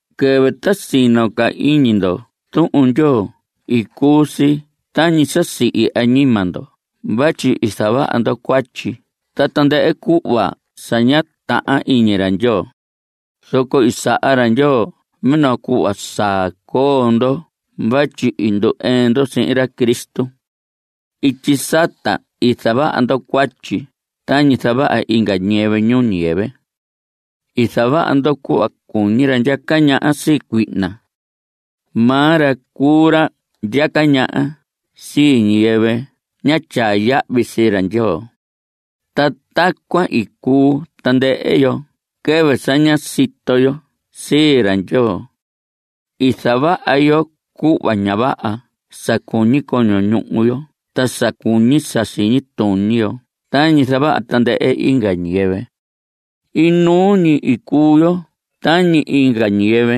Quɨvɨ ta sino ca iñi ndo Tuhun Ndyoo cuu si tañi sa sihi añima ndo vatyi i zavaha ndo cuatyi ta tandɨhɨ cuhva sa ña tahan iñi ra Ndyoo. Zoco i saha ra Ndyoo minoo cuhva saa coo ndo vatyi i ndu‑ɨɨn ndo sihin ra Cristo. Ityi sata i zavaha ndo cuatyi tañi zavaha inga ñiyɨvɨ ñuu ñiyɨvɨ. I zavaha ndo cuhva cuñi ra ndyaca ñaha sii cuihna. Maa ra cuu ra ndyaca ñaha sii ñiyɨvɨ ña tyaa yahvi sii ra Ndyoo. Ta tacuan i cuu tandɨhɨ yo quɨvɨ sa ñá sito yo sii ra Ndyoo. I zavaha yo cuhva ña vaha sa cuñi coño ñuhu yo ta sa cuñi sa siñi tuñi yo tañi zavaha tandɨhɨ inga ñiyɨvɨ. Inuu ñi i cuu yo tañi inga ñiyɨvɨ,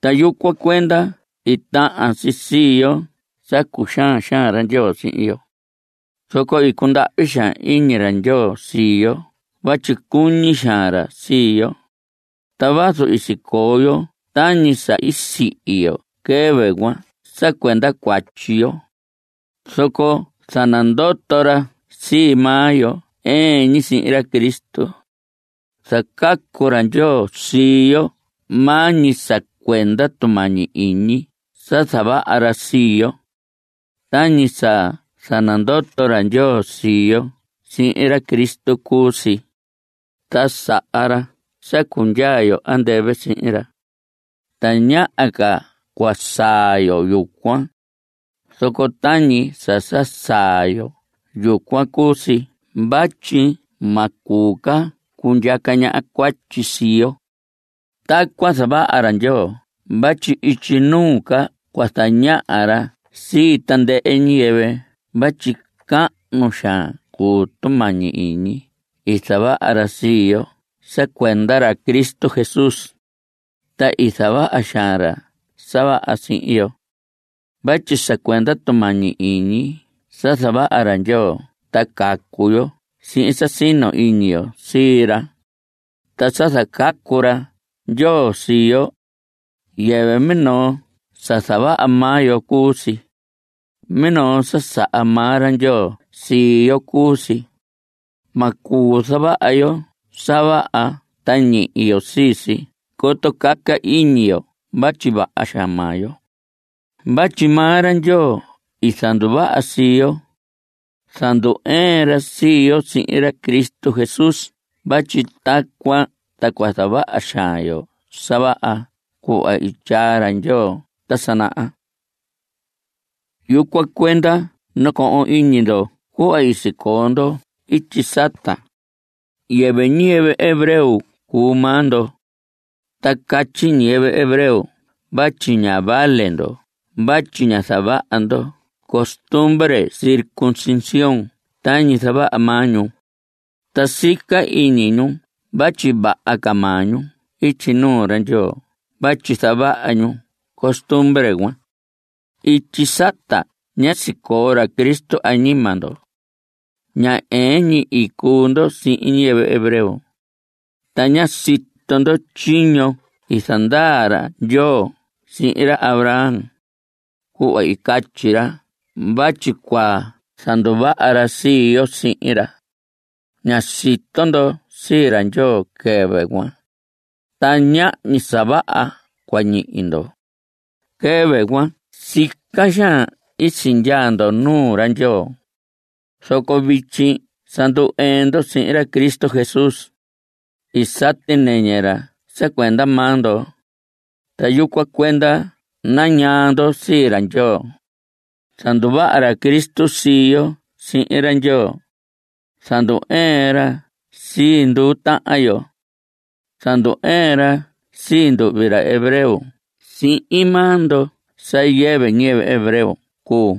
ta yucuan cuenda i tahan si sii yo sa cuxaan xaan ra Ndyoo sihin yo. Zoco i cundahvi xaan iñi ra Ndyoo sii yo vatyi cuñi xaan ra sii yo. Ta vazu i sicoo yo tañi sa i sihi yo quɨvɨ cuan sa cuenda cuatyi yo, zoco i zanandoto ra sii maa yo ɨɨn ñi sihin ra Cristo. Zacacu ra Ndyoo sii yo maa ñi sa cuenda tumañi iñi sa zavaha ra sii yo. Tañi sa zanandoto ra Ndyoo sii yo sihin ra Cristo cuu si, ta saha ra sa cundyaa yo andɨvɨ sihin ra. (Tañaha ca cua saa yo yucuan, zoco tañi sa saa yo yucuan cuu si vatyi ma cuu ca cundyaca ñaha cuatyi sii yo.) Tacuan zavaha ra Ndyoo vatyi ityi nuu ca cua zañaha ra sii tandɨhɨ ñiyɨvɨ vatyi cahnu xaan cuu tumañi iñi i zavaha ra sii yo sa cuenda ra Cristo Jesús. Ta i zavaha xaan ra sa vaha sihin yo. Vatyi sa cuenda tumañi iñi sa zavaha ra Ndyoo ta cacu yo sihin sa sino ñi iñi yo sii ra. Ta sa zacacu ra Ndyoo sii yo, yɨvɨ minoo sa zavaha maa yo cuu si. Minoo sa saha maa ra Ndyoo sii yo cuu si. Ma cuu zavaha yo sa vaha ta ñihi yo sii si coto caca iñi yo vatyi vaha xaan maa yo. Vatyi maa ra Ndyoo i zanduvaha sii yo. Zandu‑ɨɨn ra sii yo sihin ra Cristo Jesús vatyi tacuan ta cua zavaha xaan yo sa vaha cuhva i tyaa ra Ndyoo ta sa naha. Yucuan cuenda nacohon iñi ndo cuhva i sicoo ndo ityi sata. Yɨvɨ ñiyɨvɨ hebreo cuu maa ndo. Ta catyi ñiyɨvɨ hebreo vatyi ña vale ndo vatyi ña zavaha ndo costumbre circuncisión tañi zavaha maa ñu. Ta sica iñi ñu vatyi vaha ca maa ñu ityi nuu ra Ndyoo vatyi zavaha ñu costumbre cuan. Ityi sata ñá sicoo ra Cristo añima ndo. Ña ɨɨn ñi i cuu ndo sihin ñiyɨvɨ hebreo. Ta ñá sito ndo tyiño i zandaa ra Ndyoo sihin ra Abraham, cuhva i catyi ra vatyi cua zanduvaha ra sii yo sihin ra. Ñá sito ndo sii ra Ndyoo quɨvɨ cuan, ta ñahñi sa vaha cua ñihi ndo. Quɨvɨ cuan sica xaan i sindyaa ndo nuu ra Ndyoo. Zoco vityi sa ndu‑ɨɨn ndo sihin ra Cristo Jesús. I sati nɨñɨ ra sa cuenda maa ndo, ta yucuan cuenda nañaa ndo sii ra Ndyoo. Zanduvaha ra Cristo sii yo sihin ra Ndyoo. Zandu‑ɨɨn ra sii nduu tahan yo. Zandu‑ɨɨn ra sii nduhvi ra hebreo sihin maa ndo sa yɨvɨ ñiyɨvɨ hebreo cuu.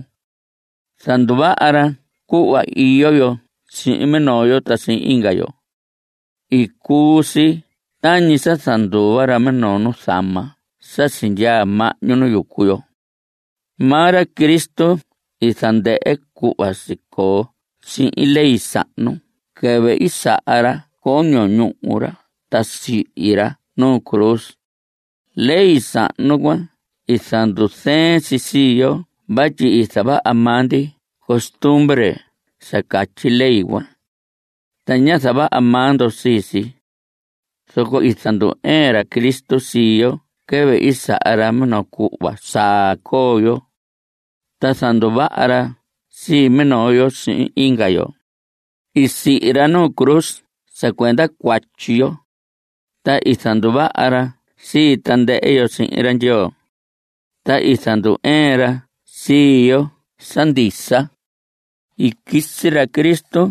Zanduvaha ra cuhva iyo yo sihin minoo yo ta sihin inga yo. I cuu si tañi sa zanduva ra minoo nuzama sa sindyaa mahñu nu yucu yo. Maa ra Cristo i zandɨhɨ cuhva sicoo sihin ley sahnu quɨvɨ i saha ra coño ñuhu ra ta sihi ra nu cruz. Ley sahnu cuan i zanduzɨɨn si sii yo vatyi i zavaha maa ndi costumbre sa catyi ley cuan, ta ñá zavaha maa ndo sii si. Zoco i zandu‑ɨɨn ra Cristo sii yo quɨvɨ i saha ra minoo cuhva saa coo yo, ta zanduvaha ra sii minoo yo sihin inga yo. I sihi ra nuu cruz sa cuenda cuatyi yo, ta i zanduvaha ra sii tandɨhɨ yo sihin ra Ndyoo. Ta i zandu‑ɨɨn ra sii yo sa ndisa. I quisi ra Cristo,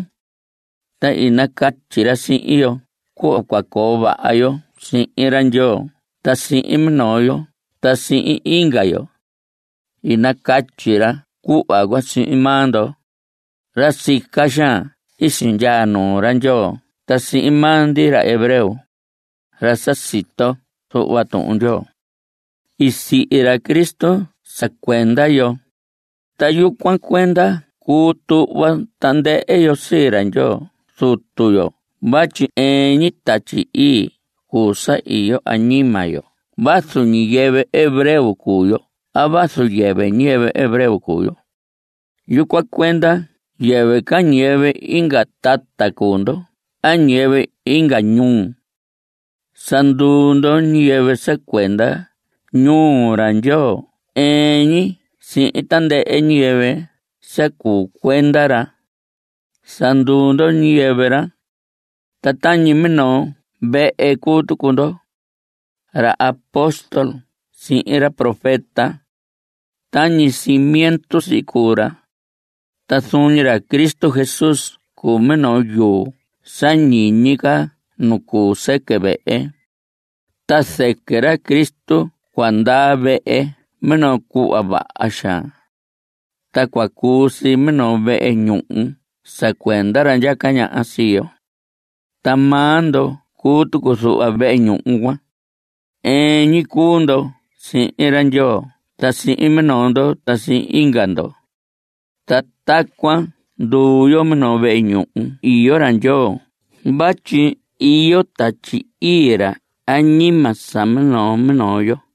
ta i nacatyi ra sihin yo cuhva cua coo vaha yo sihin ra Ndyoo ta sihin minoo yo ta sihin inga yo. I nacatyi ra cuhva cuan sihin maa ndo, ra sica xaan i sindyaa nuu ra Ndyoo ta sihin maa ndi ra hebreo, ra sa sito zuhva Tuhun Ndyoo. I sihi ra Cristo sa cuenda yo, ta yucuan cuenda cuu tuhva tandɨhɨ yo sii ra Ndyoo Zuto yo vatyi ɨɨn ñi Tatyi Ii cuu sa iyo añima yo vazu ñiyɨvɨ hebreo cuu yo a vazu yɨvɨ ñiyɨvɨ hebreo cuu yo. Yucuan cuenda yɨvɨ ca ñiyɨvɨ inga tata cuu ndo a ñiyɨvɨ inga ñuu. Sa nduu ndo ñiyɨvɨ sa cuenda ñuu ra Ndyoo ɨɨn ñi sihin tandɨhɨ ñiyɨvɨ sa cuu cuenda ra. Sa nduu ndo ñiyɨvɨ ra. Ta tañi minoo vehe cuu tucu ndo. Ra apóstol sihin ra profeta, tañi cimiento si cuu ra. Ta zuun ñi ra Cristo Jesús cuu minoo yuu sa ñiñi ca nu cuu sɨquɨ vehe. Ta zɨquɨ ra Cristo cuahan ndaa vehe minoo cuhva vaha xaan, ta cua cuu si minoo vehe ñuhu sa cuenda ra ndyaca ñaha sii yo. Ta maa ndo cuu tucu zuhva vehe ñuhu cuan. Ɨɨn ñi cuu ndo sihin ra Ndyoo ta sihin minoo ndo ta sihin inga ndo, ta tacuan nduu yo minoo vehe nu iyo ra Ndyoo vatyi iyo Tatyi Ii ra añima sa minoo minoo yo.